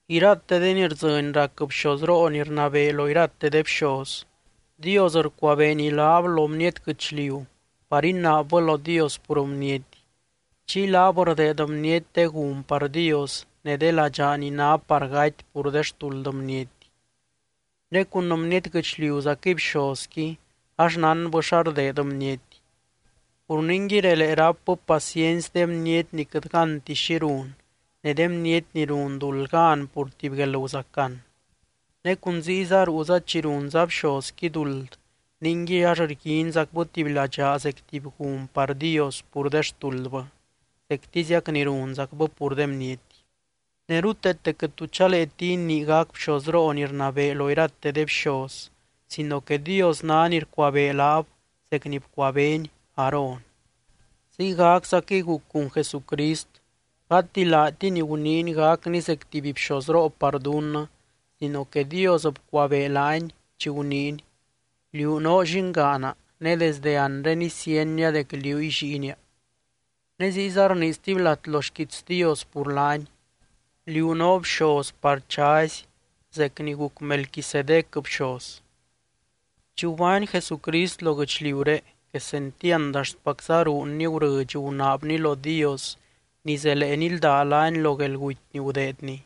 Irate de ni rdzɨny rac bxozroo ni rnabee lo irate de bxoz, Dios rcuabeeny laab lo bniety guɨchliu par inaabbɨ lo Dios pur bniety. Chiy laab rdeed bniety de gun par Dios ne de ladxaa ni ná par gaty pur de xtuld bniety. Ne cun bniety guɨchliuzaquɨy bxozqui, ax nánbɨ xa rdeed bniety. Pur ningui relee rápbɨ paciency de bniety ni quɨt gánti xi run, ne de bniety ni run duld gan pur tuby guelguzacan. Ne cun ziyza ruuza chi runza bxozqui duld ningui ax rguinzacbɨ tuby ladxaa zec tuby gun par Dios pur de xtuldbɨ, zectiziac ni runzacbɨ pur de bniety. Ne ruteete quɨt tu chaleeti inii gac bxozroo ni rnabee lo irate de bxoz, sino que Dios ná ni rcuabee laab zec ni bcuabeeny Aarón. Ziygaczaquɨy guc cun Jesucrist, gati laatiny guniiny gacny zec tuby bxozroo par dunnɨ sino que Dios bcuabee laany, chi guniiny: Liú noo Llingaana, ne desdɨ anre isienia dec liúy Lliinia. Ne ziyza rnii stuby lat lo xquiits Dios pur laany: Liú noo bxoz par chazy zec ni guc Melquisedec bxoz. Chi gubány Jesucrist lo guɨchliuré quesentiand axtpacza ruunny gurɨdx gunaabny lo Dios ni zelee nildá laany lo guelguty ni gudeedny.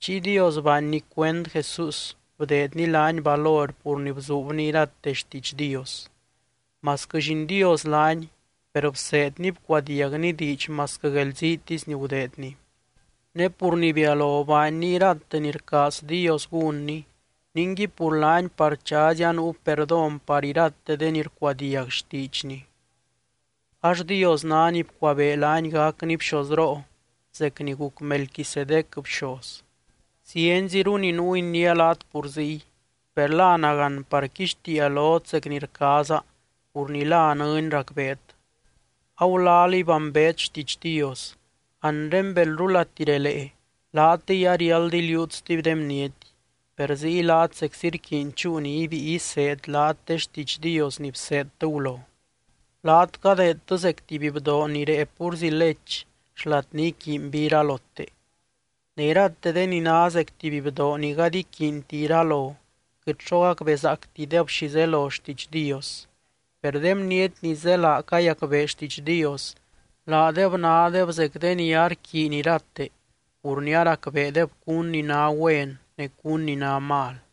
Chiy Dios baanny cuend Jesús bdeedny laany valor pur ni bzuubny irate xtiidx Dios. Masquɨ Lliin Dios laany, per bseedny bcuadiagny diidx masquɨ guelziitisy ni gudeedny. Ne pur ni bialo baanny irate ni rcaaz Dios gúnny, ningui pur laany par chazy anuu perdón par irate de ni rcuadiag xtiidxny. Ax Dios ná ni bcuabee laany gacny bxozroo zec ni guc Melquisedec bxoz. Zienziru ni nuu iniia laat pur ziy, per la nagán par quixtiia lot zec ni rcaaza pur ni la nɨny racbeet. Agulalíy bambeet xtiidx Dios, anre belrulati relee, laatɨy ariáld iliuut stuby de bniety, per ziy laat zeczi rquiiny chúu ni ibíi iseed laat de xtiidx Dios ni bseedtɨ gulo. Laat cadeedtɨ zec tuby bdoo ni rée púrzi lech xlat ni iquiinby iralote. Ne irate de ni ná zec tuby bdoo ni gady iquiinti iralo, quɨt xo gacbezaactideb zelo xtiidx Dios. Per de bniety ni zélaa cayacbee xtiidx Dios, laadeb nádeb zec de ni arquiiny irate pur ni aracbeedeb cun ni ná güen ne cun ni ná mal.